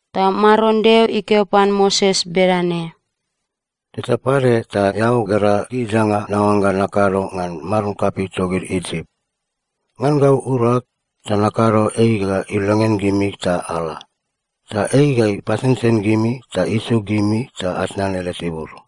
Ta Maron Deo ikeo pan Moses bedane, “Teta pade ta eao gera gid danga naoangga nakado ngan maron kapei togid Isip. Ngan gau urag ta nakado ei ga ilongean gimi ta ala. Ta ei ga ipasensen gimi ta isuk gimi ta atnan ele tibur.”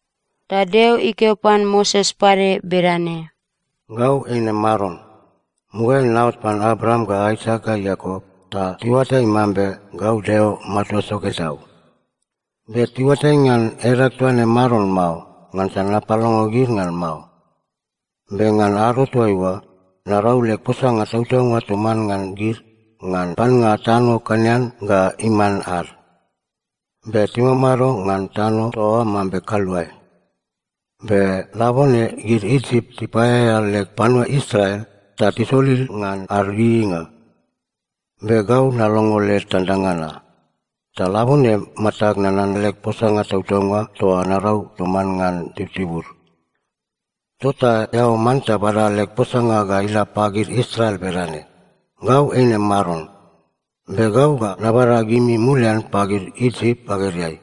Ta Deo ikeo pan Moses pade bedane, “Gau eine Maron. Mugaeai naot pan Abraam ga Aisak ga Iakop, ta tiuatai mambe gau Deo Matua Soke Tau. Be tiuatai ngan edag toaine Maron mao, ngansa napalongo gid ngan mao. Be ngan ado toaiua, narau leg posanga tautaunga toman ngan gid ngan pannga tano Kenan ga iman ad. Be timamado ngan tano toa oa mambe kaluae. Be labone gid Isip tipaeaea leg panua Israel, ta tisolil ngan ad ieieinga. Be gau nalongo led tandanga na. Ta labone matag nanan leg posanga tautaunga toa narau toman ngan tibutibud. “Tota eao manta bada leg posanga ga ila pagid Israel bedane: Gau eine Maron. Be gau ga nabada gimi mulian pagid Isip bagedeai,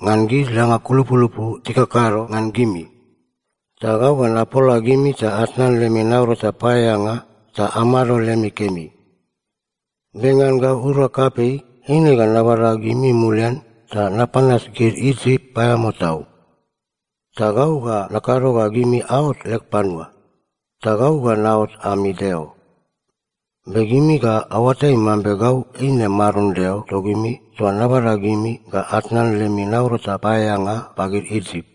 ngan gid danga kulupulupu tikakado ngan gimi. Ta gau ga napola gimi ta atnan lemi naurata paeaeanga ta amado lemi kemi. Be ngan gau urag kapei, eine ga nabada gimi mulian ta napanas gid Isip paeamao tau. Ta gau ga nakado ga gimi aot leg panua, ta gau ga naot ami Deo. Be gimi ga aoatai mambe gau eine Maron Deo togimi toa nabada gimi ga atnan lemi naurata paeaeanga pagid Isip.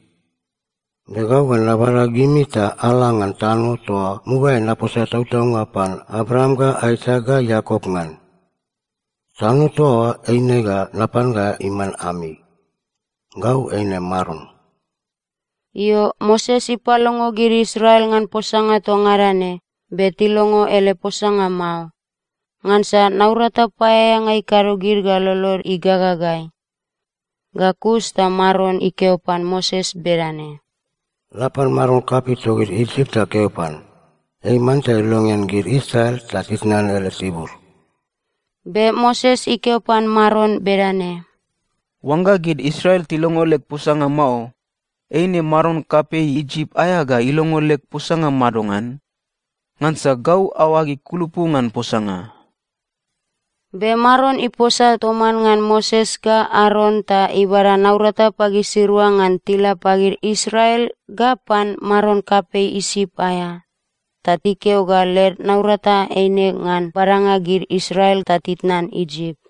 Be gau ga nabada gimi ta ala ngan tano toa mugaeai naposa tautaunga pan Abraam ga Aisak ga Iakop ngan. Tano toa oa eine ga napan ga iman ami. Gau eine Maron.” Io, Moses ipalongo gid Israel ngan posanga toa ngada ne, be tilongo ele posanga mao. Ngansa naurata paeaeanga ikado gid ga lolod igagagai. Ga kus ta Maron ikeo pan Moses bedane, “La pan maron kapei togid Isip ta keo pan, ei manta ilongean gid Israel ta titnan ele tibur.” Be Moses ikeo pan Maron bedane, “Oangga gid Israel tilongo leg posanga mao, eine maron kapei Isip aea ga ilongo leg posanga madongan? Ngansa gau aoag ikulupu ngan posanga.” Be Maron iposa toman ngan Moses ga Aron ta ibada naurata pagisirua ngan tila pagid Israel ga pan maron kapei Isip aea, ta ikeo ga led naurata eine ngan badanga gid Israel ta titnan Isip.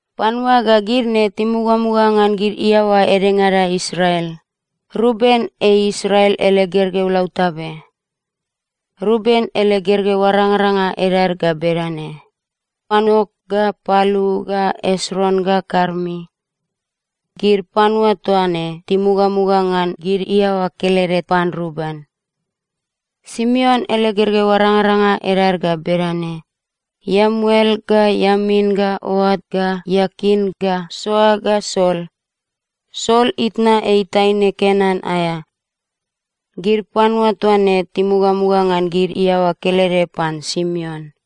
Panua ga gid ne timugamuga ngan gid iaoa edengada Israel. Ruben ei Israel ele gergeu lautabe. Ruben ele gergeu arangaranga edad ga bedane: Anok ga Palu ga Esron ga Karmi. Gid panua toa ne timugamuga ngan gid iaoa kelede pan Ruben. Simeon ele gergeu arangaranga edad ga bedane: Iemuel ga Iamin ga Oat ga Iakin ga Soar ga Saul. Saul itna ei taine Kenan aea. Gid panua toa ne timugamuga ngan gid iaoa kelede pan Simeon.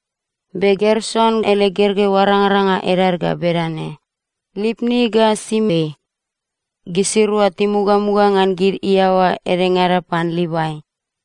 Be Gerson ele gergeu arangaranga edad ga bedane: Lipni ga Simei. Gisirua timugamuga ngan gid iaoa edengada pan Livai.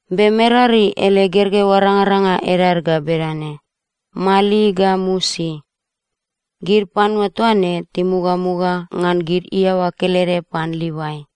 Be Merari ele gergeu arangaranga edad ga bedane: Mali ga Musi. Gid panua toa ne timugamuga ngan gid iaoa kelede pan Livai.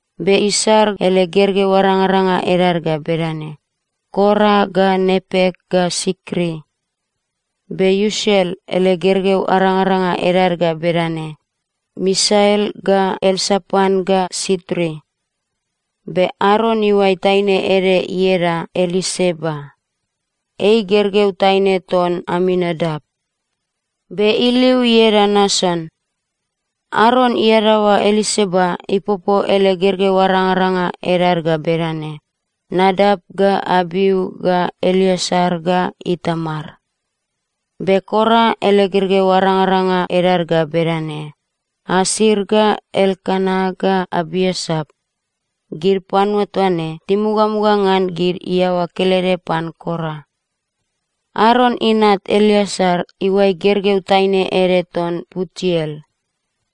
Be Isar ele gergeu arangaranga edad ga bedane: Kora ga Nepek ga Sikri. Be Usiel ele gergeu arangaranga edad ga bedane: Misael ga Elsapan ga Sitri. Be Aron iuai taine ede ieda Eliseba. Ei gergeu taine ton Aminadap, be iliu ieda Nason. Aron iadaoa Eliseba ipopo ele gergeu arangaranga edad ga bedane: Nadap ga Abiu ga Eleasar ga Itamar. Be Kora ele gergeu arangaranga edad ga bedane: Asir ga Elkana ga Abiasap. Gid panua toa ne timugamuga ngan gid iaoa kelede pan Kora. Aron inat Eleasar iuai gergeu taine ede ton Putiel.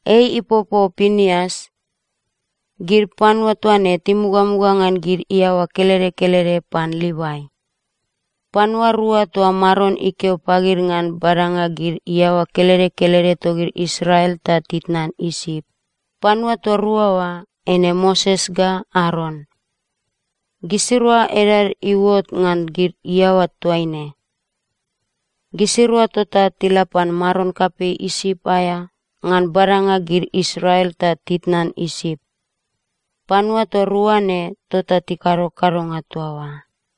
Ei ipopo Pinias. Gid panua toa ne timugamuga ngan gid iaoa kelede kelede pan Livai. Panua rua toa Maron ikeo pagid ngan badanga gid iaoa kelede kelede togid Israel ta titnan Isip, panua toa rua oa, eine Moses ga Aron. Gisirua edad iuot ngan gid iaoa toaine. Gisirua tota tila pan maron kapei Isip aea ngan badanga gid Israel ta titnan Isip. Panua toa rua ne tota tikado kadonga toa oa.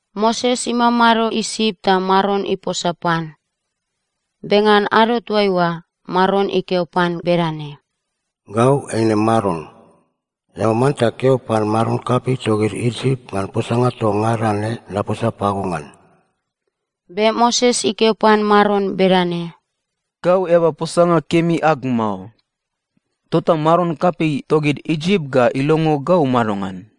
Moses imamado Isip ta Maron iposa pan. Be ngan ado toaiua, Maron ikeo pan bedane, “Gau eine Maron. Eao manta keo pan maron kapei togid Isip ngan posanga toa ngada ne naposa pago ngan.” Be Moses ikeo pan Maron bedane, “Gau eaba posanga kemi ag mao. Tota maron kapei togid Isip ga ilongo gau madongan?”